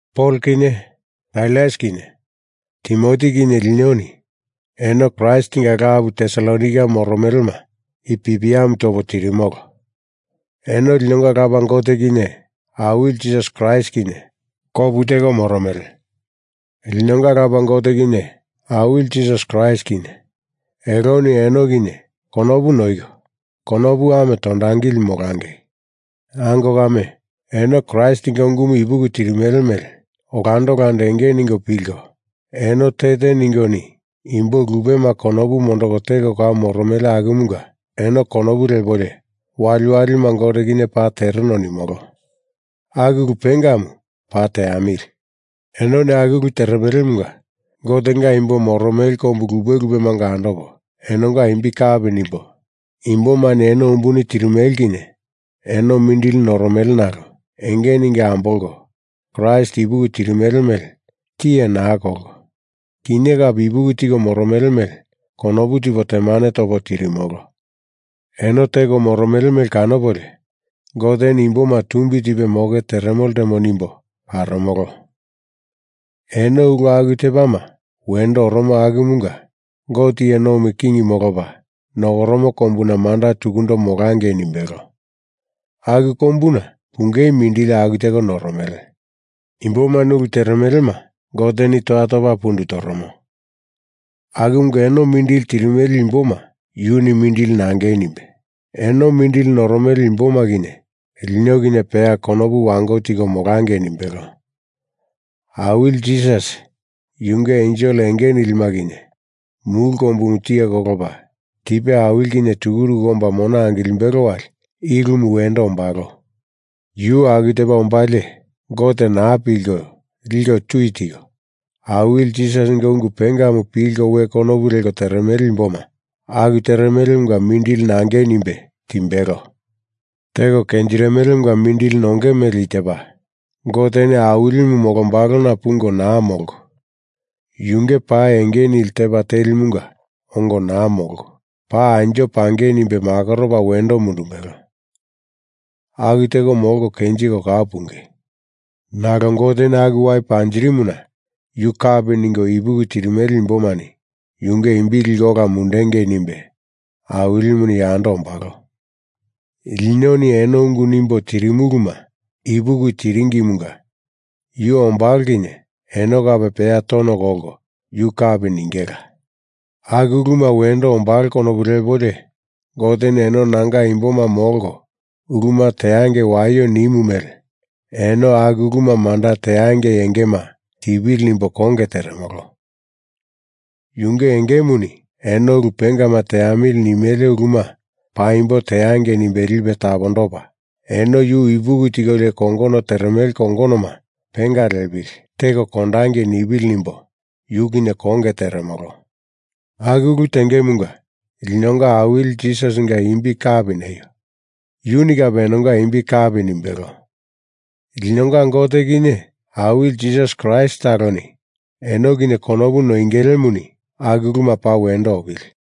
Pol kinye Sailas kinye Timoti kinye linoni eno Kraistinga lapu Tesalonaika moromelema i pipiamu topo tirimolo. Eno linonga Lapa Gote kinye Awili Jisasi Kraist kinye kopu teko moromele. Linonga Lapa Gote kinye Awili Jisasi Kraist kinye eloni eno kinye konopu noiko konopu ame tondangili molangei. Ango kame, eno Kraistinga ungumu ipuki tirimele mele olando olando enge ningo pilko, eno te te ningoni imbo lupema konopu mondoko teko kau moromele akumunga eno konopu lepolio waliwalima Gote kinye paa tereno nimolo. Aku ulu pengamu paa teamili. Enoni aku ulu teremelemunga Gotenga imbo moromele kombu lupe lupemanga andopo, enonga imbi kapi nimbo, imbomani eno umbuni tirimele kinye eno mindili noromele nalo enge ningo ambolko Kraist ipuki tirimele mele tiye naa kolko, kinye kape ipuki tiko moromele mele konopu tipo temane topo tirimolo. Eno teko moromele mele kanopolio, Goteni imboma tumbi tipe moke teremo ltemo nimbo karomolo. Eno ulu aku tepama wendo oromo akumunga Gote iye nomi king molopa nokoromo kombuna manda tukundo molangei nimbelo. Aku kombuna pungei mindili aku teko noromele. Imbomani ulu teremelema Goteni toya topa pundu toromo, akumunga eno mindili tirimele imboma yuni mindili nangei nimbe, eno mindili noromele imboma kinye lino kinye peya konopu wango tiko molangei nimbelo. Awili Jisasi yunge ensel enge nilima kinye mulu kombumu tiye kolopa tipe awili kinye tukuruku omba mona angilimbelo wali i ulumu wendo ombalo. Yu aku tepa ombalie Gote naa pilko liko tui tiko, Awili Jisasinga ungu pengamu pilko we konopu leko teremele imboma aku teremelemunga mindili nangei nimbe timbelo. Teko kenjirimelemunga mindili nonge mele i tepa: Goteni Awilimu molombalona pungo naa molko, yunge pa enge nili tepa telimunga ongo naa molko, paa anjo pangei nimbe makoropa wendo mundumbelo, aku teko molko kenjiko kau punge. Nalo Goteni aku wai panjirimuna Yu kapi ningo ipuki tirimele imbomani yunge imbi liko ola mundengei nimbe Awilimuni yando ombalo. Linoni eno ungu nimbo tirimuluma ipuki tiringimunga yu ombalo kinye eno kape peya tono kolko yu kapi ningela. Aku uluma wendo ombalo konopu lepolio Goteni eno nanga imboma molko uluma teangei waio nimu mele eno aku uluma manda teangei engema tipili nimbo konge teremolo. Yunge engemuni eno ulu pengama teamili nimele uluma paimbo teangei nimbe lipe tapondopa, eno Yu ipuki tikolio kongono teremele kongonoma penga lepili, teko kondangei nipili nimbo yu kinye konge teremolo. Aku ulu tengemunga linonga Awili Jisasinga imbi kapi neio. Yuni kape enonga imbi kapi nimbelo. Linonga Gote kinye Awili Jisasi Kraist taloni eno kinye konopu noingelemuni aku uluma paa wendo opili.